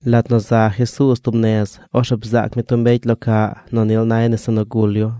Lat nu za Jesuuz tub nez, orzeꞌ bzaac mi tub mbecy lo caꞌ nu nil nay nese nu gul yu.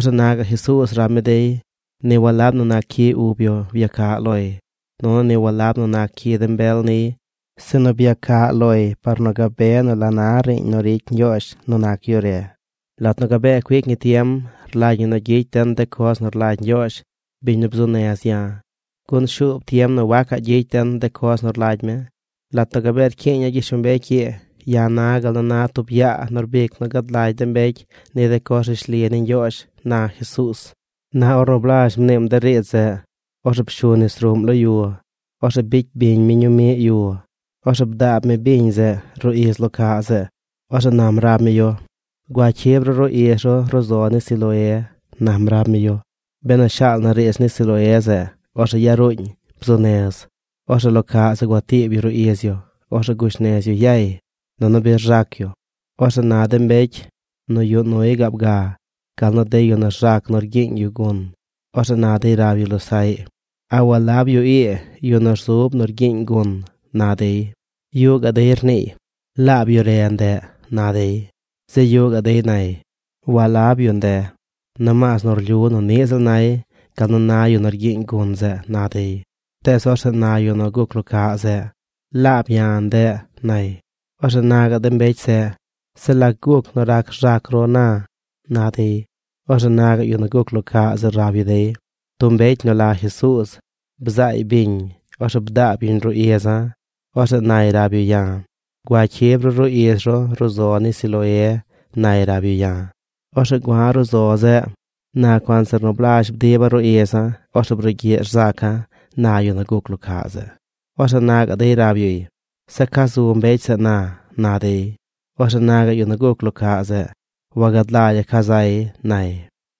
Orzeꞌ na gaꞌ Jesuuz rab mi dey: ―Ni walab nu nac cyi ub yu byacaꞌ loy, nunu ni walab nu nac cyi de mbel niy, sinu byacaꞌ loy par nu gabe nu la na riiñ nu ricy Ñgyoozh nu nac yu re. Lat nu gabee cuic ñi tiem, rlagy ñi nu gyicy den de coz nu rlagy Ñgyoozh, biñ nu bzuu nez ya̱, gun shuub tiem nu wacaꞌ gyicy den coz nu rlagy mi. Lat nu gabee rcyiiña̱ gyishlombecy ii, ya̱ na gal nu na tub yaa nu rbic nu gad lagy de mbecy ni de coz rishli ni Ñgyoozh ―na Jesuuz. Na ornu blazh mniim de riidz zeꞌ, orzeꞌ pshu nis ruꞌm lo yu. Orzeꞌ bicy biñ mi ñuu miꞌ yu. Orzeꞌ bdaab mi biñ zeꞌ ruꞌ iz lo caꞌ zeꞌ. Orzeꞌ nam rab mi yu: ―Gua cyib ru ruꞌ iz ru ruꞌ zo ni Siloé ―nam rab mi yu. (Benu shaal na riidz ni Siloé zeꞌ, orzeꞌ yaruuñ: Bzuu nez.) Orzeꞌ lo caꞌ zeꞌ gua tiib yu ruꞌ iz yu. Orzeꞌ gush nez yu yay, nunu bi rzac yu. Orzeꞌ na de mbecy nu yuꞌ nuy gaab ga gal nu de yu nu rzac nu rgyiiñ yu gun, orzeꞌ na dey rab yu losaꞌy: ―¿A walab yu ii yu nu rzub nu rgyiiñ gun? ―na dey. Yuꞌ gaꞌ dey rniiy: ―Laab yu re ndeꞌ ―na dey. Zeꞌ yuꞌ gaꞌ dey nay: ―Walab yu nde; nomaas nu rlyu nu niꞌ ziꞌl nay gal nu na yu nu rgyiiñ gun zeꞌ ―na dey. Tees, orzeꞌ na yu nu guc lo caꞌ zeꞌ: ―Laab ya̱ ndeꞌ ―nay. Orzeꞌ na gaꞌ de mbecy zeꞌ: ―¿Zeꞌ lac guc nu rac rzac ru na? ―na dey. Orzeꞌ na gaꞌ yu nu guc lo caꞌ zeꞌ rab yu dey: ―Tub mbecy nu la Jesuuz bzaay biñ. Orzeꞌ bdaab yuñ ruꞌ iza̱. Orzeꞌ nay rab yu ya̱: “Gua cyib ru ruꞌ iz ru ruꞌ zo ni Siloé”, nay rab yu ya̱. Orzeꞌ gua̱ ruꞌ zo zeꞌ. Na cuanzir nu blazh bdiba̱ ruꞌ iza̱, orzeꞌ brugyiꞌ rzaca̱ ―na yu nu guc lo caꞌ zeꞌ. Orzeꞌ na gaꞌ dey rab yuy: ―¿Zeꞌ ca zu mbecy zeꞌ na? ―na dey. Orzeꞌ na gaꞌ yu nu guc lo caꞌ zeꞌ: ―Wagad lagya̱ ca zay ―nay.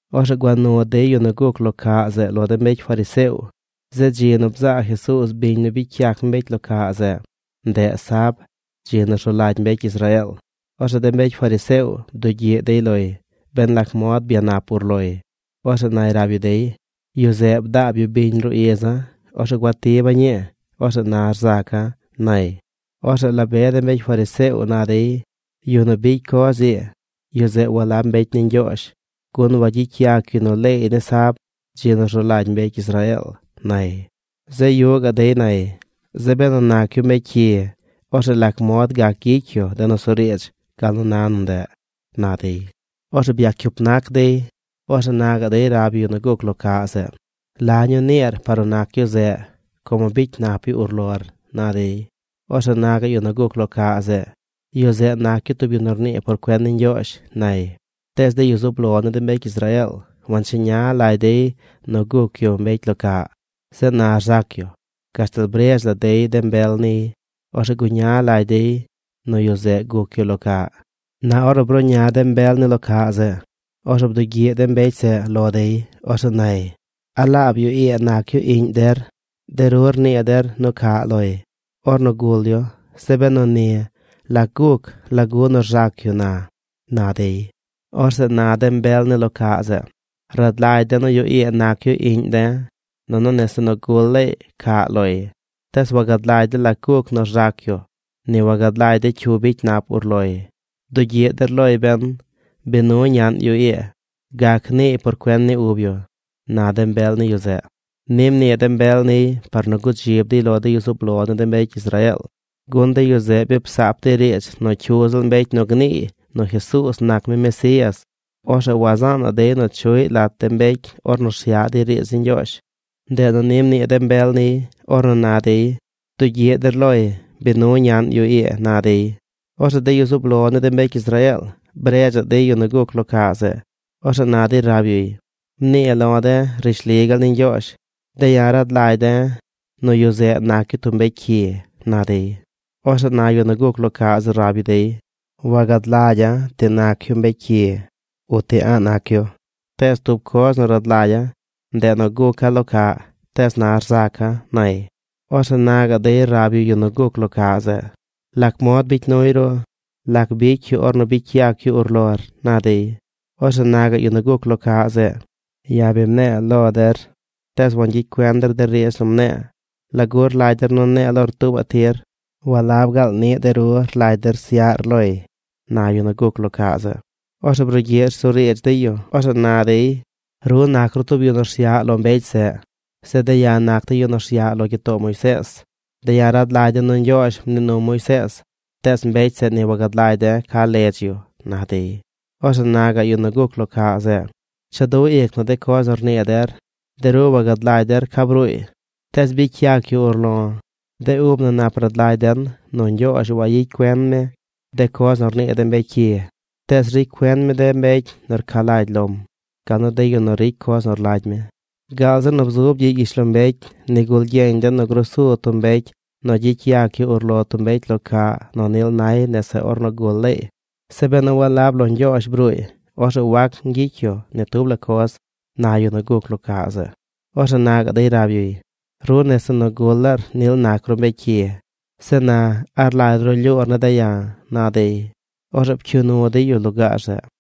Orzeꞌ gua nu dey yu nu guc lo caꞌ zeꞌ lo de mbecy fariseo. Zeꞌ dzi nu bzaa Jesuuz biñ nu bicy yac mi mbecy lo caꞌ zeꞌ, ndeꞌ sab, dzi nu rzu lagy mbecy Israeel. Orzeꞌ de mbecy fariseo bdugyiꞌ dey loy, ben lac mod byanap ur loy. Orzeꞌ nay rab yu dey: ―Yu zeꞌ bdaab yu biñ ruꞌ iza̱. Orzeꞌ gua tiba̱ ñii. Orzeꞌ na rzaca̱ ―nay. Orzeꞌ la be de mbecy fariseo na dey: ―Yu nu bicy coz ii, yu zeꞌ walab mbecy ni Ñgyoozh, gun wagyicy yac yu nu leey ni sab, dzi nu rzu lagy mbecy Israeel ―nay. Zeꞌ yuꞌ gaꞌ dey nay: ―Zeꞌ benu nac yu mbecy cyi, orzeꞌ ¿lac mod gac gyicy yu de nusuriidz gal nu na nu ndeꞌ? ―na dey. Orzeꞌ byac cyup nac dey. Orzeꞌ na gaꞌ dey rab yu yu nu guc lo caꞌ zeꞌ: ―¿La ñuu niir par nu nac yu zeꞌ, como bicy nap yu urlor? ―na dey. Orzeꞌ na gaꞌ yu nu guc lo caꞌ zeꞌ: ―Yu zeꞌ nac yu tub yu nu rnii por cuen ni Ñgyoozh ―nay. Tees de yu zub lo ni de mbecy Israeel wancheña lagy dey nu guc yu mbecy lo caꞌ, zeꞌ na rzac yu, gashtal bredz la dey de mbel niy. Orzeꞌ guña lagy dey nu yu zeꞌ guc yu lo caꞌ. Na ornu bruꞌña de mbel ni lo caꞌ zeꞌ, orzeꞌ bdugyiꞌ de mbecy zeꞌ lo dey. Orzeꞌ nay: ―¿A laab yu ii nac yu iꞌñ der? De ru rnii der nu caꞌ loy ornu gul yu. Zeꞌ benu ni, ¿lac guc? ¿Lagu nu rzac yu na? ―na dey. Orzeꞌ na de mbel ni lo caꞌ zeꞌ: ―Rad lagy de̱ nu yu ii nac yu iꞌñ de̱, nunu nese nu gul laay caꞌ loy. Tees wagad lagy de̱ lac guc nu rzac yu. Ni wagad lagy de̱ cyu bicy nap urloy. Bdugyiꞌ der loy ben. Bi nu ñaꞌn yu ii. Gac niiy por cuen ni ub yu ―na de mbel ni yu zeꞌ. Ni mnii de mbel niy par nu gudzib dey lo de yu zub lo ni de mbecy Israeel, gun de yu zeꞌ bi psaap dey riidz nu cyu ziꞌl mbecy nu gniiy nu Jesuuz nac mi Mesías, orzeꞌ wazaanaꞌ dey nu chuꞌy lat de mbecy ornu rsyaꞌ dey riidz ni Ñgyoozh. Ndeꞌ nu ni mnii de mbel niy, ornu na dey: “Bdugyiꞌ der loy. Bi nu ñaꞌn yu ii”, na dey. Orzeꞌ de yu zub lo ni de mbecy Israeel bredza̱ꞌ dey yu nu guc lo caꞌ zeꞌ. Orzeꞌ na dey rab yuy: ―Mnii lo̱ de̱ rishli gaal ni Ñgyoozh. De̱ ya̱ rad lagy de̱ nu yu zeꞌ nac yu tub mbecy cyi ―na dey. Orzeꞌ na yu nu guc lo caꞌ zeꞌ rab yu dey: ―Wagad lagya̱ ti nac yu mbecy cyi o ti a̱ꞌ nac yu. Tees tub coz nu rad lagya̱, ndeꞌ nu guca̱ lo caꞌ, tees na rzaca̱ ―nay. Orzeꞌ na gaꞌ dey rab yu yu nu guc lo caꞌ zeꞌ: ―¿Lac mod bicy nuy ru? ¿Lac bicy yu ornu bicy yac yu urlor? ―na dey. Orzeꞌ na gaꞌ yu nu guc lo caꞌ zeꞌ: ―Ya̱ bi mne̱e̱ lo der, tees wangyicy cuen der de riidz nu mne̱e̱. ¿Lagu rlagy der nu ne̱e̱ lor tuubaꞌ tir? ¿Walab gaal niꞌ de ru rlagy der syaꞌr loy? ―na yu nu guc lo caꞌ zeꞌ. Orzeꞌ brugyiꞌ rsuriidz dey yu. Orzeꞌ na dey: ―Ru nac ru tub yu nu rsyaꞌ lo mbecy zeꞌ. Zeꞌ de̱ ya̱ naca̱ yu nu rsyaꞌ lo gyitoo Moisees. De̱ ya̱ rad lagy de̱ nu Ñgyoozh mnii num Moisees, tees mbecy zeꞌ, ni wagad lagy de̱ ca ledz yu ―na dey. Orzeꞌ na gaꞌ yu nu guc lo caꞌ zeꞌ: ―¡Cha du ic na de coz nu rnii der! De ru wagad lagy der ca bruuy, tees bicy yac yu urlo̱. De ub na nap rad lagy den nu Ñgyoozh wayicy cuen mi de coz nu rnii de mbecy cyi; tees ricy cuen mi de mbecy nu rca lagy lom gal nu de yu nu ricy coz nu rlagy mi. Gaal zi nu bzub gyiꞌ gyishlombecy nigul gyeñ den nu gruu su tub mbecy nu gyicy yac yu urlo tub mbecy lo caꞌ nu nil nay nese ornu gul laay. Zeꞌ benu walab lo Ñgyoozh bruuy, orzeꞌ wac ñgyicy yu ni tub la coz ―na yu nu guc lo caꞌ zeꞌ. Orzeꞌ na gaꞌ dey rab yuy: ―Ru nese nu gul laar nil nac ru mbecy cyi. Zeꞌ na, ¿a rlagy ru rlyuur ne̱ de̱ ya̱? ―na dey. Orzeꞌ pcyuu nu dey yu lugaar zeꞌ.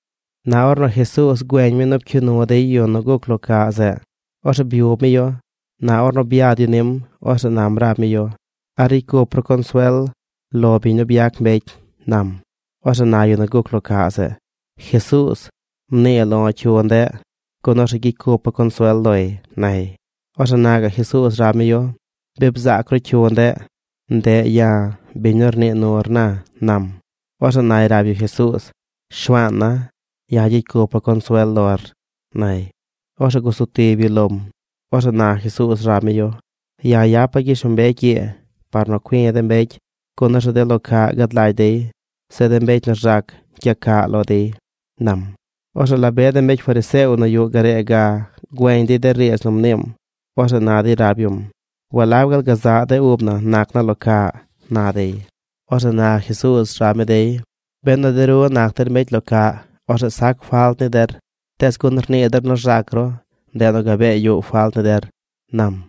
Na ornu Jesuuz güeñ mi nu pcyuu nu dey yu nu guc lo caꞌ zeꞌ, orzeꞌ byub mi yu. Na ornu byad yu nim, orzeꞌ nam rab mi yu: ―¿A ricy cup ru consuel lo biñ nu byac mbecy? ―nam. Orzeꞌ na yu nu guc lo caꞌ zeꞌ: ―Jesuuz, mnii lo̱ cyu ndeꞌ, gun orzeꞌ gyicy cupa̱ consuel loy ―nay. Orzeꞌ na gaꞌ Jesuuz rab mi yu: ―Bi bzaac ru cyu ndeꞌ. Ndeꞌ ya̱, biñ nu rnii nur na ―nam. Orzeꞌ nay rab yu Jesuuz: ―Shuaana̱, ya̱ gyicy cupa̱ consuel lor ―nay. Orzeꞌ guzu tib yu lom. Orzeꞌ na Jesuuz rab mi yu: ―Ya̱ yapa̱ gyishlombecy ii par nu cui̱ de mbecy, gun orzeꞌ de lo caꞌ gad lagy dey. Zeꞌ de mbecy nu rzac gyacaꞌ lo dey ―nam. Orzeꞌ la be de mbecy fariseo nu yuꞌ garee ga güeñ dey de riidz nu mniim. Orzeꞌ na dey rab yum: ―¿Walab gaal gazaꞌ de ub na nac na lo caꞌ? ―na dey. Orzeꞌ na Jesuuz rab mi dey: ―Benu de ru nac der mbecy lo caꞌ, orzeꞌ sac falt ni der, tees gun rnii der nu rzac ru, ndeꞌ nu gabee yuꞌ falt ni der ―nam.